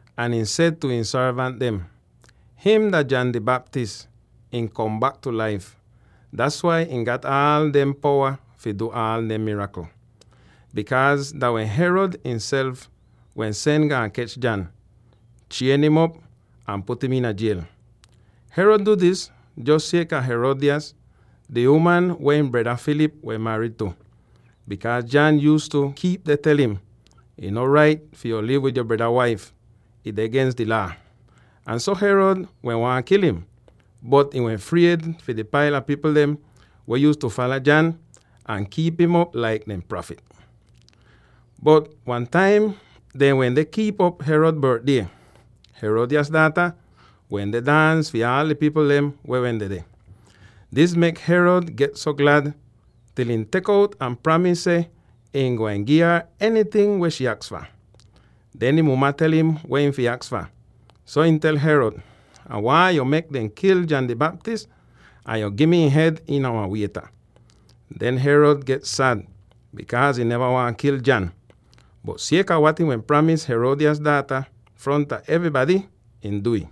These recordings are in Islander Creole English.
ahn ihn seh tu ihn sorvant dem, “Him dah John di Baptist! Ihn kom bak tu laif; das wai ihn gat aal demde powa fi du aal demde mirakl!” Bikaaz dah wehn Herod ihnself wehn sen gaan kech John, chien'im op, ahn put im iina jiel. Herod du dis jos sieka Herodias, di uman weh ihn breda Philip wehn marid tu, bikaaz John yuuztu kiip deh tel im, “Ih no rait fi yu liv wid yo breda waif; ih deh gens di Laa!” Ahn so, Herod wehn waahn kil im, bot ihn wehn fried fi di paila pipl dem weh yuuztu fala John ahn kiip im op laik dehn prafit. Bot wentaim dehn wende kiip'op Herod bortdie, Herodias daata wende daans fi aal di pipl dem weh wehn dedeh. Dis mek Herod get so glad, til ihn tek uot ahn pramis seh ihn gwain gi'ar enyting weh shii aks fah. Den ihn muma tel im weh ihn fi aks fah, so ihn tel Herod, “Ah waahn yo mek dem kil John di Baptist, ahn yo gi mi ihn hed iina wan wieta!” Den Herod get sad bikaaz ihn neva waahn kil John, bot sieka wat ihn wehn pramis Herodias daata fronta evrybady, ihn du'ih.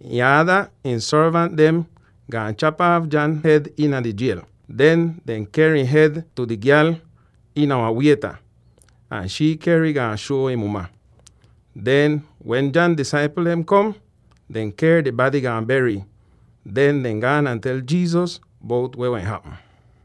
Ihn aada ihn sorvant dem gaan chap aaf John hed iina di jiel. Den dehn ker ihn hed tu di gyal iina wan wieta, ahn shii ker'ih, gaan shuo ihn muma. Den wen John disaipl dem kom, dehn ker di bady gaan ber'ih. Den dehn gaan ahn tel Jesus bout weh wen hapm.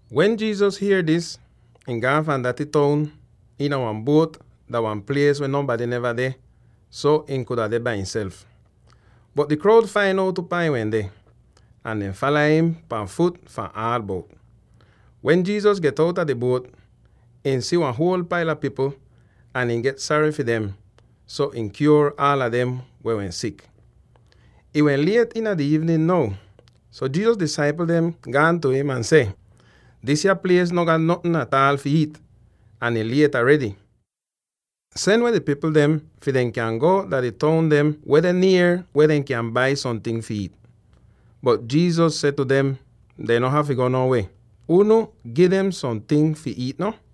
Wen Jesus hier dis, ihn gaan fahn daty toun iina wan buot dah wan plies weh nonbady neva deh, so ihn kuda deh bai imself. Bot di kroud fain out upaa ihn wende, ahn dehn fala im pan fut fahn aal bout. Wen Jesus get outa di buot, ihn si wan huol paila pipl ahn ihn get sary fi dem, so ihn kyuor aala dem weh wehn sik. Ih wehn liet iina di iivnin now, so Jesus disaipl dem gaan tu im ahn seh, “Disya plies no gat notn ataal fi iit, ahn ih liet aredy. Sen weh di pipl dem fi dehn kyan go dah di toun dem weh deh nier weh dehn kyan bai somting fi iit.” Bot Jesus seh tu dem, “Dehn no hafy go no wie; unu gi dem somting fi iit no.”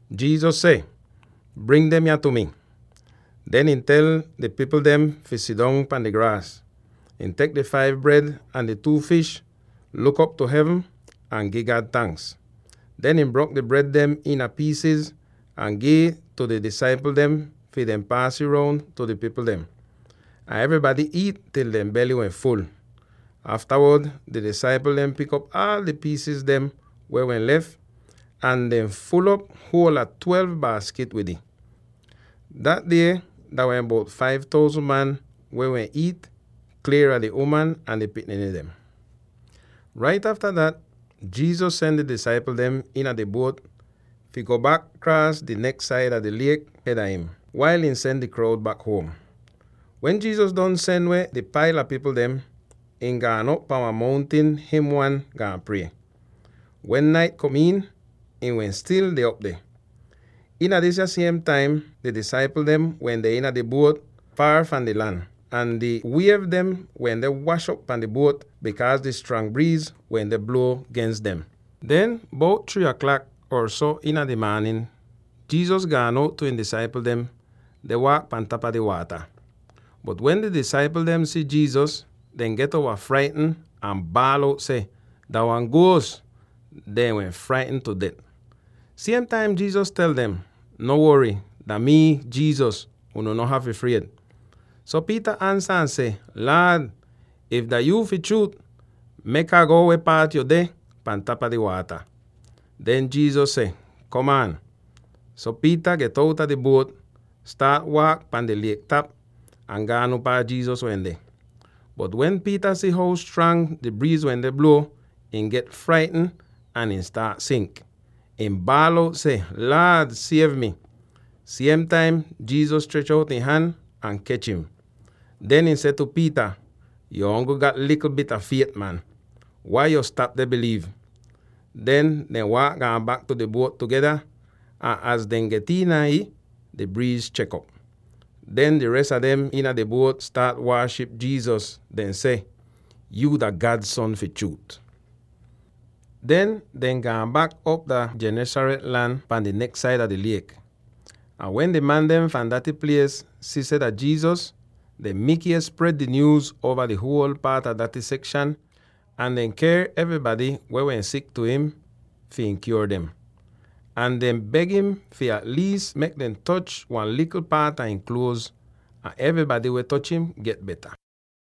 Jesus seh, “Bring dem yah tu mi.” Den ihn tel di pipl dem fi sidong pahn di graas. Ihn tek di five bred ahn di two fish, luk op tu hevn ahn gi God tanks. Den ihn brok di bred dem iina piisiz ahn gi'ih tu di disaipl dem fi dehn paas ih roun tu di pipl dem. Ahn evrybady iit til dehn bely wehn ful. Aftawod di disaipl dem pik op aal di piis dem weh wehn lef, ahn dehn ful'op huol a twelve baaskit wid ih. Dat die dah wehn bout five thousand man weh wehn iit, plien a di uman ahn di pikniny dem! Rait afta dat Jesus sen di disaipl dem iina di buot fi go bak kraas di neks saida di liek hed a im, wail ihn sen di kroud bak huom. Wen Jesus don sen weh di paila pipl dem, ihn gaan op pahn wan mountin him wan, gaan prie. Wen nait kom iin, ihn wehn stil deh op deh. Iina disya siem taim di disaipl dem wende iina di buot foor fahn di lan, ahn di wiev dem wende wash op pahn di buot, bikaaz di strang briiz wende bluo gens dem. Den, bout three aklak or so iina di maanin, Jesus gaan out tu ihn disaipl dem, deh waak pahn tapa di waata! Bot wen di disaipl dem si Jesus, dehn get uova fraitn ahn baal out seh, “Dah wan guos!” Dehn wehn fraitn tu det. Siem taim Jesus tel dem, “No wory. Dah mii, Jesus; unu no hafy fried!” So Peter ansa ahn seh, “Laad, if dah yuu fi chruut, mek Ah go weh paat yo deh pan tapa di waata.” Den Jesus seh, “Komaan!” So Peter get outa di buot, staat waak pahn di liek tap, ahn gaan upaa Jesus wende. Bot wen Peter si how strang di briiz wende bluo, ihn get fraitn, ahn ihn staat sink. Ihn baal out seh, “Laad, siev mi!” Siem taim Jesus strech out ihn han, ahn kech im. Den ihn seh tu Peter, “Yo ongl gat likl bit a fiet, man. Wai yo stap deh biliiv?” Den dehn waak gaan bak tu di buot tugeda, ahn az dehn get iina ih, di briiz chek'op! Den di res a dem iina di buot staat waaship Jesus, deh seh, “Yuu dah God son fi chruut!” Den dehn gaan bak op dah Gennesaret lan pahn di neks saida di liek. Ahn wen di man dem fahn daty plies si seh dah Jesus, dehn mikies spred di nyuuz uova di huol paat a daty sekshan ahn dehn ker evrybady weh wehn sik tu im, fi ihn kyuor dem. Ahn dehn beg im fi at liis mek dem toch wan likl paat a ihn kluoz. Ahn evrybady weh toch im, get beta.